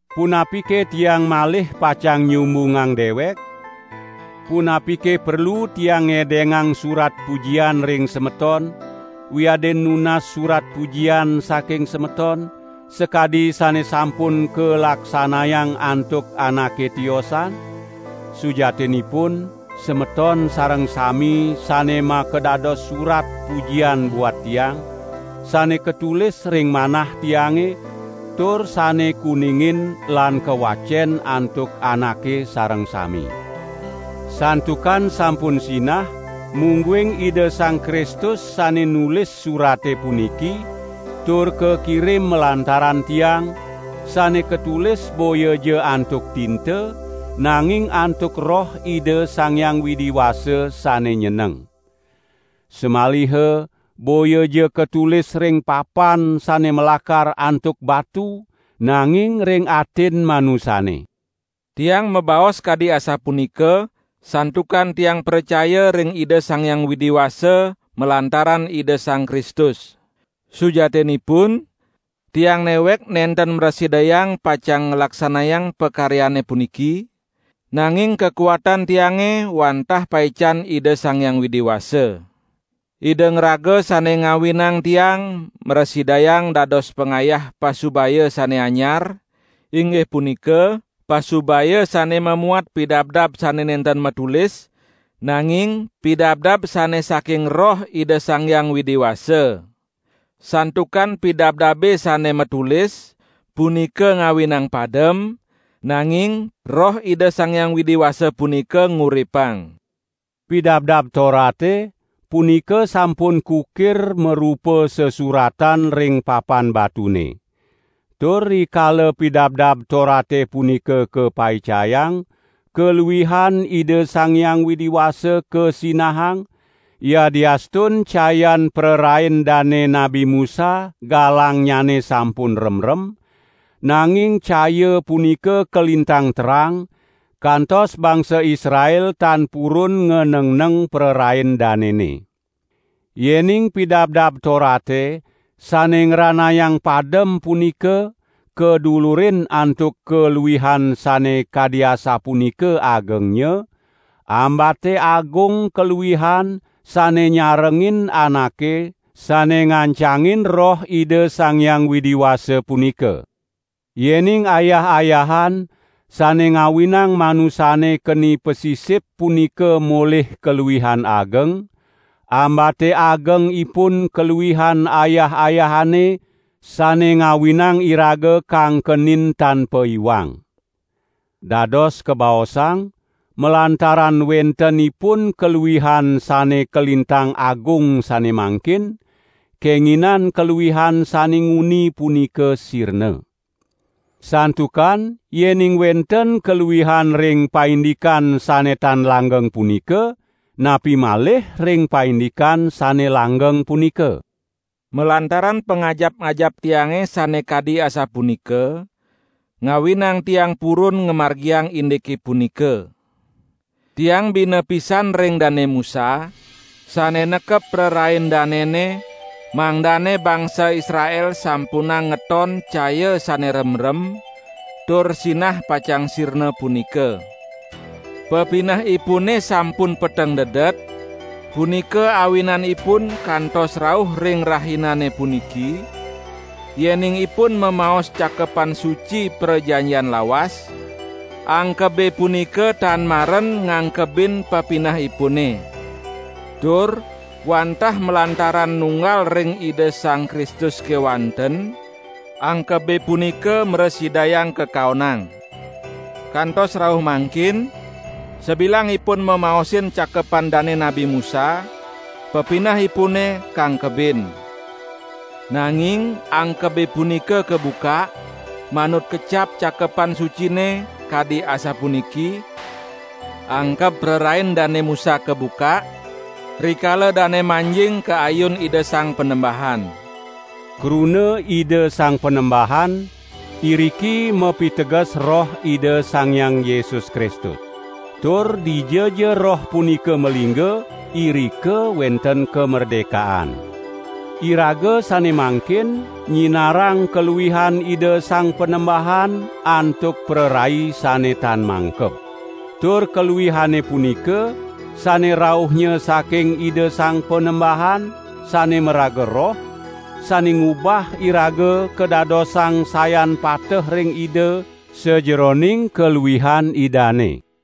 Punapike tiang malih pacang nyumbungang dewek? Punapike perlu tiang ngedengang surat pujian ring semeton, wiadin nunas surat pujian saking semeton, sakadi sane sampun kalaksanayang antuk anake tiosan? Sujatinipun semeton sareng sami sane makadados surat pujian buat tiang, sane katulis ring manah tiange, tur sane kuningin lan kawacen antuk anake sareng sami. Santukan sampun sinah mungguing Ida Sang Kristus sane nulis surate puniki, tur kakirim malantaran tiang, sane katulis boyaja antuk tinta, nanging antuk Roh Ida Sang Hyang Widi Wasa sane nyeneng. Samaliha boyaja katulis ring papan sane malakar antuk batu, nanging ring atin manusane. Tiang mabaos kadi asapunika santukan tiang pracaya ring Ida Sang Hyang Widi Wasa malantaran Ida Sang Kristus. Sujatinipun tiang newek nenten mrasidayang pacang nglaksanayang pakaryane puniki, nanging kakuatan tiange wantah paican Ida Sang Hyang Widi Wasa. Ida ngraga sane ngawinang tiang mrasidayang dados pangayah pasubaya sane anyar, inggih punika pasubaya sane mamuat pidabdab sane nenten matulis, nanging pidabdab sane saking Roh Ida Sang Hyang Widi Wasa. Santukan pidabdabe sane matulis punika ngawinang padem, nanging Roh Ida Sang Hyang Widi Wasa punika nguripang. Pidabdab Torate, punika sampun kukir marupa sasuratan ring papan batune. Tur rikala Pidabdab Torate punika kapaicayang, kaluihan Ida Sang Hyang Widi Wasa kasinahang, yadiastun cayan prarain dane Nabi Musa galangnyane sampun remrem, nanging caya punika kalintang terang, kantos bangsa Israel tan purun nganengneng prarain danene. Yening Pidabdab Torate sane ngranayang padem punika kadulurin antuk kaluihan sane kadi asapunika agengnya, ambate agung kaluihan sane nyarengin anake sane ngancangin Roh Ida Sang Hyang Widi Wasa punika. Yening ayah-ayahan sane ngawinang manusane keni pasisip punika molih kaluihan ageng, ambate ageng ipun kaluihan ayah-ayahane sane ngawinang iraga kangkenin tan paiwang. Dados kabaosang, malantaran wenten ipun kaluihan sane kalintang agung sane mangkin, kenginan kaluihan sane nguni punika sirna. Santukan yening wenten kaluihan ring paindikan sane tan langgeng punika, napi malih ring paindikan sane langgeng punika. Malantaran pangajap-ajap tiange sane kadi asapunika, ngawinang tiang purun ngamargiang indike punika. Tiang bina pisan ring Dane Musa, sane nekep prarian danene mangdane bangsa Israel sampunang ngeton caya sane remrem tur sinah pacang sirna punika. Pepinehipune sampun peteng dedet, punika awinanipun kantos rauh ring rahinane puniki, yening ipun mamaos Cakepan Suci Prajanjian Lawas, angkebe punika tan maren ngangkebin pepinehipune. Tur wantah malantaran nunggal ring Ida Sang Kristus kewanten angkebe punika mrasidayang kakaonang. Kantos rauh mangkin, sabilang ipun mamaosin cakepan dane Nabi Musa, pepinehipune kangkebin. Nanging angkebe punika kabukak, manut kecap Cakepan Sucine, kadi asapuniki: "Angkeb prarain Dane Musa kabukak, rikala dane manjing ka ayun Ida Sang Panembahan." Kruna "Ida Sang Panembahan" iriki mapiteges Roh Ida Sang Hyang Yesus Kristus. Tur dijaja Roh punika malingga, irika wenten kamerdekaan. Iraga sane mangkin nyinarang kaluihan Ida Sang Panembahan antuk prarai sane tan mangkeb. Tur kaluihane punika sane rauhnya saking Ida Sang Panembahan, sane maraga Roh, sane ngubah iraga kadadosang sayan pateh ring Ida, sajeroning kaluihan Idane.